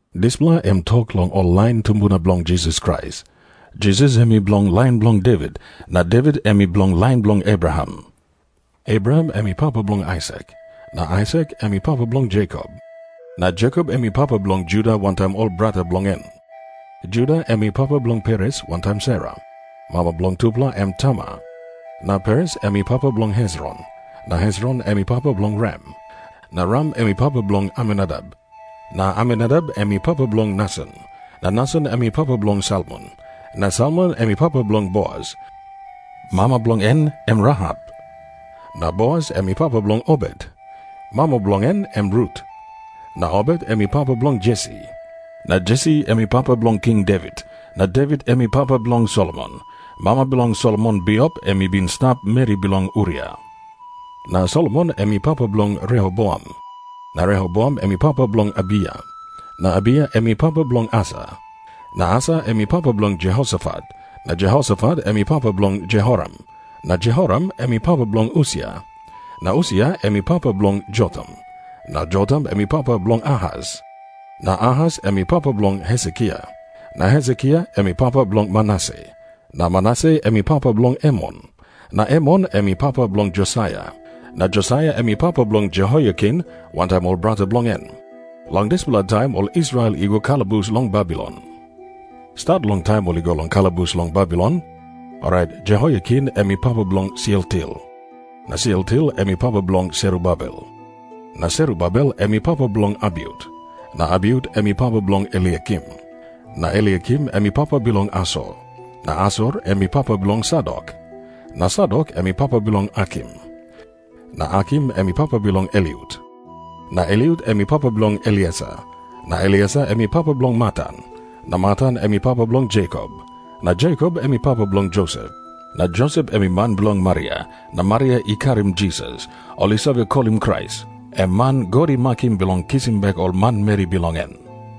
Dispela em i tok long ol lain tumbuna bilong Jisas Krais. Jisas em i bilong lain bilong Devit na Devit em i bilong lain bilong Abraham. Abraham em i papa bilong Aisak. Na Aisak em i papa bilong Jekop. Na Jekop em i papa bilong Juda wantaim ol brata bilong en. Juda em i papa bilong Peres wantaim Sera. Mama bilong tupela em Tamar. Na Peres em i papa bilong Hesron. Na Hesron em i papa bilong Ram. Na Ram em i papa bilong Aminadap. Na Aminadap em i papa bilong Nason. Na Nason em i papa bilong Salmon. Na Salmon em i papa bilong Boas. Mama bilong en em Rahap. Na Boas em i papa bilong Obet. Mama bilong en em Rut. Na Obet em i papa bilong Jesi. Na Jesi em i papa bilong King Devit. Na Devit em i papa bilong Solomon. Mama bilong Solomon bipo em i bin i stap meri bilong Uria. Na Solomon em i papa bilong Rehoboam. Na Rehoboam em i papa bilong Abiya. Na Abiya em i papa bilong Asa. Na Asa em i papa bilong Jehosafat. Na Jehosafat em i papa bilong Jehoram. Na Jehoram em i papa bilong Usia. Na Usia em i papa bilong Jotam. Na Jotam em i papa bilong Ahas. Na Ahas em i papa bilong Hesekia. Na Hesekia em i papa bilong Manase. Na Manase em i papa bilong Emon. Na Emon em i papa bilong Josaia. Na Josaia em i papa bilong Jehoiakin wantaim ol brata bilong en. Long dispela taim ol Israel i go kalabus long Babilon. Stat long taim ol i go kalabus long Babilon, orait Jehoiakin em i papa bilong Sealtiel. Na Sealtiel em i papa bilong Serubabel. Na Serubabel em i papa bilong Abiut. Na Abiut em i papa bilong Eliakim. Na Eliakim em i papa bilong Asor. Na Asor em i papa bilong Sadok. Na Sadok em i papa bilong Akim. Na Akim em i papa bilong Eliut. Na Eliut em i papa bilong Eleasar. Na Eleasar em i papa bilong Matan. Na Matan em i papa bilong Jekop. Na Jekop em i papa bilong Josep. Na Josep em i man bilong Maria. Na Maria i karim Jisas, ol i save kolim em Krais, em man God i makim bilong kisim bek ol manmeri bilong en.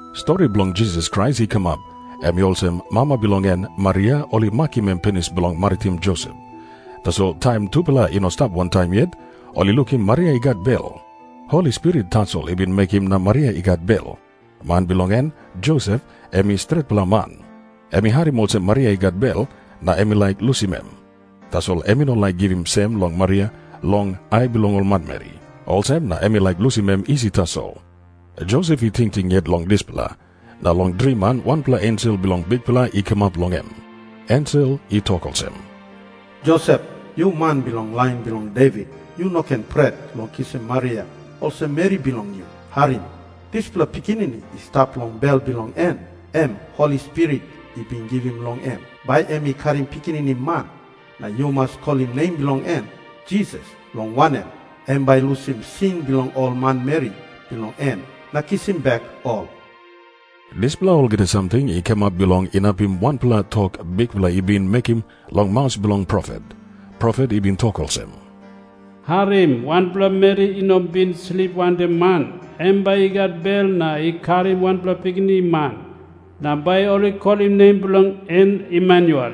Stori bilong Jisas Krais i kamap, em i olsem. Mama bilong en, Maria, ol i makim em pinis bilong maritim Josep. Tasol taim tupela i no i stap wantaim yet, ol i lukim Maria i gat bel. Holi Spirit tasol i bin mekim na Maria i gat bel. Man bilong en, Josep, em i stretpela man. Em i harim olsem Maria i gat bel, na em i laik lusim em. Tasol em i no laik givim sem long Maria long ai bilong ol manmeri. Olsem na em i laik lusim em isi tasol. Josep i tingting yet long dispela, na long driman wanpela ensel bilong Bikpela i kamap long em. Ensel i tok olsem, “Josep, yu man bilong lain bilong Devit, yu no ken pret long kisim Maria olsem meri bilong yu. Harim. Dispela pikinini i stap long bel bilong en, em Holi Spirit i bin givim long em. Bai em i karim pikinini man, na yu mas kolim nem bilong en Jisas, long wanem, em bai i lusim sin bilong ol manmeri bilong en na kisim bek ol.” Dispela olgeta samting i kamap bilong inapim wanpela tok Bikpela i bin mekim long maus bilong profet. Profet i bin tok olsem, “Harim. Wanpela meri i no bin slip wantaim man, em bai i gat bel na i karim wanpela pikinini man. Na bai ol i kolim nem bilong en Emanuel.”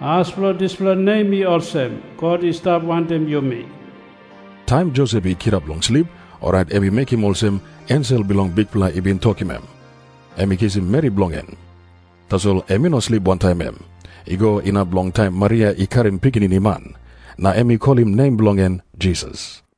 As bilong dispela nem i olsem, God i stap wantaim yumi. Taim Josep i kirap long slip, orait em i mekim olsem ensel bilong Bikpela i bin tokim em. Em i kisim meri bilong en. Tasol em i no slip wantaim em, i go inap long taim Maria i karim pikinini man. Na em i kolim nem bilong en Jisas.